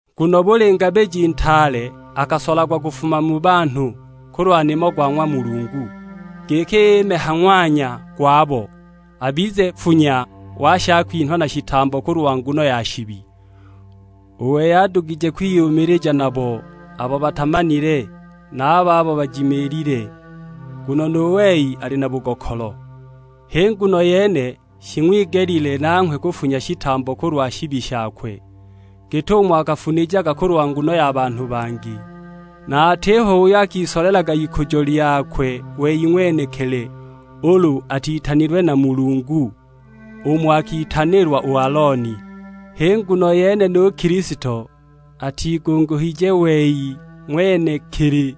Nguno buli ngabiji ntaale akasolagwa kufuma mu banhu kulwa nimo go ng'wa Mulungu, giki ime ha ng'wanya gwabo, abize nfunya wa shakwinha na shitambo kulwa nguno ya shibi. U wei adugije kwiyumilija nabo abo batamanile, na a babo bajimiilile, nguno nu wei ali na bugokolo. H'i nguno yene shing'wigelile nanghwe kufunya shitambo kulwa shibi shakwe, git'umo akafunijaga kulwa nguno ya banhu bangi. Na atiho uyo akisolelaga ikujo lyakwe wei ng'wenekili ulu atitanilwe na Mulungu, umo akitanilwa u Alooni. H'i nguno yene nu Kilisto atigunguhije wei ng'wenekili,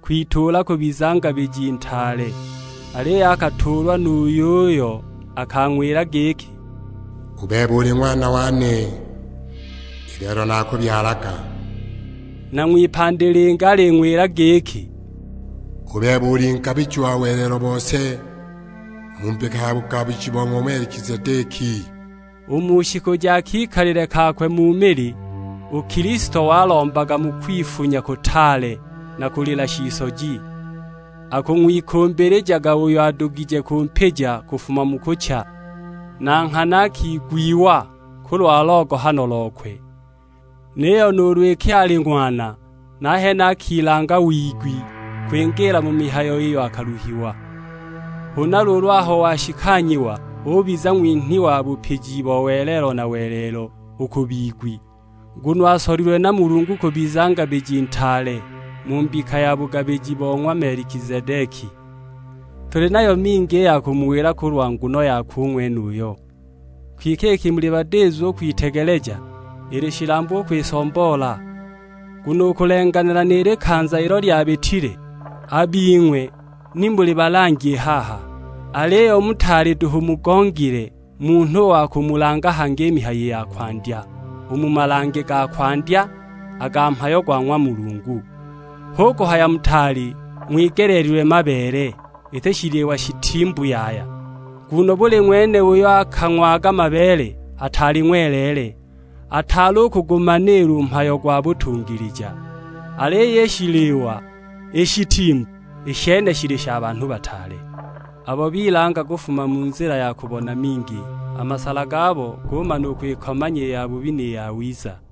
kwituula kubiza Ngabiji Ntaale; aliyo akatuulwa nu yuyo akang'wila giki, "U bebe uli Ng'wana wane, i lelo naakubyalaga." Na ng'wipandi lingi aling'wila giki, "U bebe uli Ngabiji wa welelo bose mu mbika ya bugabiji bo ng'wa Melikizedeki." U mu shiku ja kikalile kakwe mu mili, u Kilisto walombaga mu kwifunya kutaale na kulila shisoji, akung'wikumbilijaga uyo adugije kumpija kufuma mu kucha; na nghana akigwiwa kulwa logohano lokwe. Niyo nuulu iki ali Ng'wana, nahene akilanga wigwi kwingiila mu mihayo iyo akaluhiwa. Huna luulu aho washikanyiwa, ubiza ng'winhi wa bupiji bo welelo na welelo u ku bigwi. Nguno asolilwe na Mulungu kubiza Ngabiji Ntaale mu mbika ya bugabiji bo ng'wa Melikizedeki. Tuli nayo mingi i ya kumuwila kulwa nguno yakwe u ng'wenuyo, kwike iki muli badizu u kwitegeleja, ili shilambu u kwisomboola. Nguno u kulenganila ni likanza ilo lyabitile, a bing'we ni muli balangi i haha. Aliyo mutaali duhu mugongile munhu wa kumulanga hangi i mihayo ya kwandya, u mu malange ga kwandya a ga mhayo gwa ng'wa Mulungu! Hu kuhaya mutaali ng'wigeleelilwe mabeele, iti shiliwa shitimbu yaya. Nguno buli ng'wene uyo akang'waga mabeele ataali ng'weleele, ataali u kugumaniila u mhayo gwa butungilija. Aliyo i shiliwa i shitimbu, i shene shili sha banhu bataale, abo bilanga kufuma mu nzila ya kubona mingi; a masala gabo gumana u kwikomanya i yabubi ni yawiza.